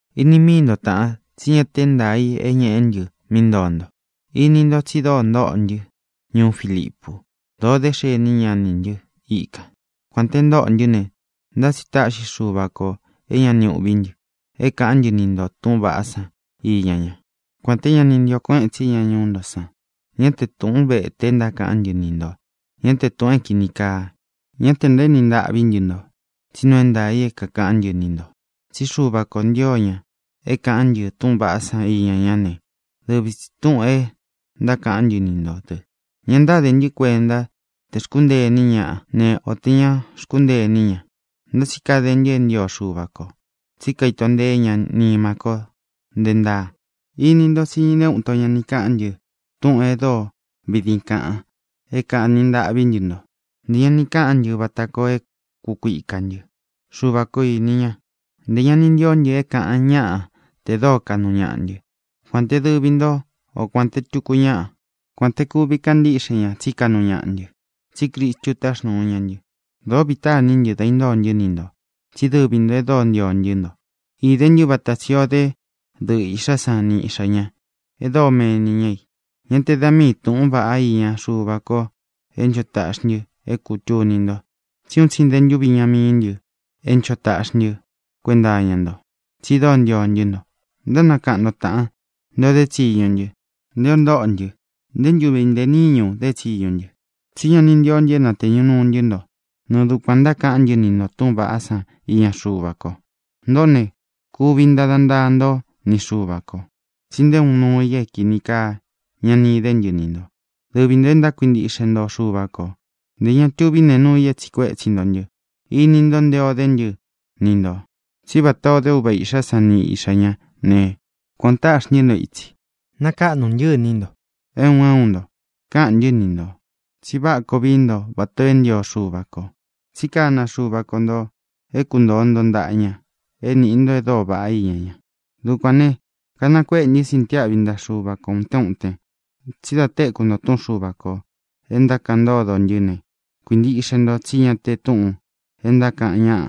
Ini míi nto, taʼan, tsí ña te é ntaā i é ñeʼé ntɨ mí ntoo nto. Ini ntó tsi dóo ntóʼo ntɨ́ ñuú Filipu. Dōo dé xeni ñaʼa nī ntɨ́ ikān. Kuān te ntóʼō ntɨ́ ne, ntá tsi táʼxi Xuva kō é ña ni uʼví ntɨ é kāʼán ntɨ ni ntō túʼūn vaʼá san iña ñá, kuān té ña ni ntio kuéʼen tsi ña ñuú nto san. Ñá te tūʼún vete e ntákaʼán ntɨ ni ntō, ñá te tūʼun é kīni kaa. Ñá tē ntaéni ntaʼví ntɨ nto, tsí nuu é ntaā i é kākaʼán ntɨ ni ntō. Tsí Xuva kō ntio ña é kāʼán ntɨ túʼūn vaʼá iña ñá ne, dɨvi tsī túʼūn e ntákaʼán ntɨ ni ntō dɨ. Ña ntáde ntɨ́ kuenta te xkúntee iní ñaʼa ne, o tē ñá xkúntee iní ña, ntá tsi kade ntɨ é ntio Xuva kō, tsí kaito nteé ña nima ko nte ntáa. Ini ntó tsi nté uun ito ña ni káʼān ntɨ túʼūn e dóo vidin kaʼan é kāni ntaʼví ntɨ nto. Ntē ña ni káʼán ntɨ vata koo é kukuika ntɨ. Xuva ko īni ña. Ntē ña ni ntíó ntɨ é kāʼan ñáʼa te dóo kaʼnu ñaʼa ntɨ́, kuān te dɨvi ntó o kuān te tuku ñáʼa, kuān te kuvi kaʼan ntíʼxe ña tsí kaʼnu ñaʼa ntɨ, tsí Cristu táxnūu ña ntɨ. Dōó vītá iní ntɨ dá intóo ntɨ́ ni ntō, tsí dɨvi ntō e dóo ntio ntɨ́ nto. Īde ntɨ́ vata tsī ó de dɨʼɨ īʼxá san ni iʼxā ñá e dóo meni ña i. Ñá te da mii tūʼún vaʼá iña Xuva ko é ncho taʼxi ntɨ é kūtuni nto, tsí un tsi nte ntúvi iña mií ntɨ é ncho taʼxi ntɨ́ kuenta iña nto, tsi dóo ntio ntɨ́ nto. Ntánakaʼan nto, tāʼan, nté ō dé tsiñu ntɨ́, nté ō ntóʼo ntɨ. Nté ntuvi ntē níñu dé tsiñu ntɨ, tsí ña ni ntíó ntɨ é natēñu nuu ntɨ́ nto nɨɨ dukuān ntákaʼán ntɨ ni ntō túʼūn vaʼá san iña Xuva ko. Ntōʼó ne, kuvi ntada ntaa ntó ni Xuva kō tsi nté uun nuu i é kīni kaa ña ni idé ntɨ ni ntō, dɨvi ntō e ntákuintiʼxe nto Xuva kō. Ntē ña tuví nee nuu i é tsīʼi kuétsi nto ntɨ. Ini ntó nte o dé ntɨ ni ntō. Tsí vatā ó de uva īʼxá san ni iʼxā ñá ne, kuān o táʼxi ntɨ́ nto itsi. Nakáʼnu ntɨ́ iní nto, é un é un nto. Káʼān ntɨ́ ni ntō tsi váʼa koo vií nto vatā o é ntio Xuva kō, tsi kána Xuva ko ntō é kuntōo nto ntaʼa ña, é nīʼi nto e dóo vaʼá iña ña. Dukuān ne, kanakuéʼe ntɨ́ sintiáʼvi ntaʼa Xuva ko ūtén uten, tsí da téku nto túʼun Xuva kō e ntákaʼan ntódo ntɨ́ ne, kuīntiʼxe nto tsí ña te túʼūn e ntákaʼan ñáʼa,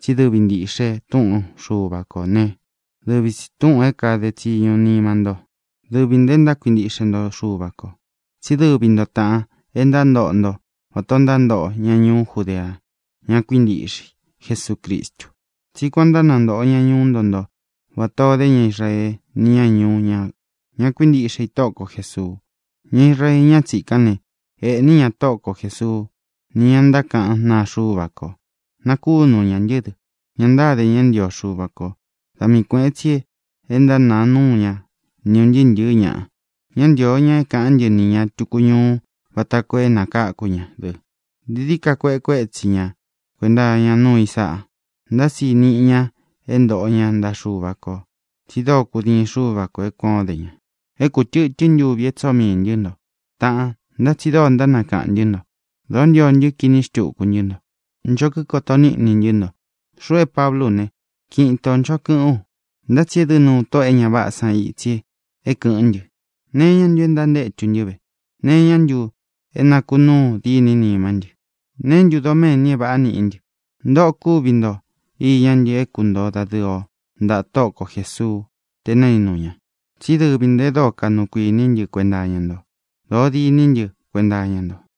tsí dɨvi ntīʼxe túʼun Xuva kō né, dɨvi tsi tūʼun é kāde tsiñu nima ntó, dɨvi ntō e ntákuintiʼxe nto Xuva kō. Tsí dɨvi nto, tāʼan, e ntántoʼo nto vatā ó ntántoʼo ña ñuú Judea, ña kuíntiʼxe i Jesucristu. Tsí kuān ó ntánantoʼo ña ñuú nto nto vatā o dé ña Israee ni ñá ñuú ña, ña kuíntiʼxe i Tóʼo ko Jēsuu. Ña Israee ñá tsīkán ne, ēʼní ña Tóʼo ko Jēsuu ni ñá ntákaʼan náa Xuva ko. Nakúnu ñā ntɨ́ dɨ. Ña ntáde ña é ntio Xuva kō; da mii kuēʼen tsi e ntánāa núu ña ni ūn ntɨɨ́ ntɨ̄ɨ́ ñaʼa. Ñá ntīo ña é kāʼán ntɨ nī ña tuku ñuu vata koo é nakáku ña dɨ. Dií dií ka kueʼe kuétsi ña kuēnta iña núu i sáʼa. Ntá tsi niʼi ña é ntoʼo ña ntaʼa Xuva kō, tsi dóo kudiin Xuva ko é kuān ó de ña. É kūtɨtɨ́n ntuvi e tsóo miī ntɨ́ nto, taʼan, ntá tsi dóo ntánakaʼān ntɨ́ nto. Dōó ntio ntɨ kiní xtuku ntɨ́ nto. Ncho kíkoto níʼni ntɨ́ nto. Xuʼu é Pablú u ne, kiʼin itō nchó kɨʼɨ́n u, ntá tsi edɨ́ nuu tóʼō e ña váʼā san itsi é kɨ̄ʼɨ́n ntɨ. ¿Nee iñá ntu é ntantétu ntɨ́ ve? ¿Nee iñá ntu é nākunuu dîní nimá ntɨ? ¿Neé ntu doméni é vāʼá niʼí ntɨ? Ntōʼo kúvi nto iñá ntɨ é kuntoo dadɨ̄ɨ o ntaʼa Tóʼo ko Jēsuu te naínu ña. Tsí dɨvi ntō e dóo kaʼnu kuiní ntɨ kuenta iña nto. Dōó diní ntɨ kuenta iña nto.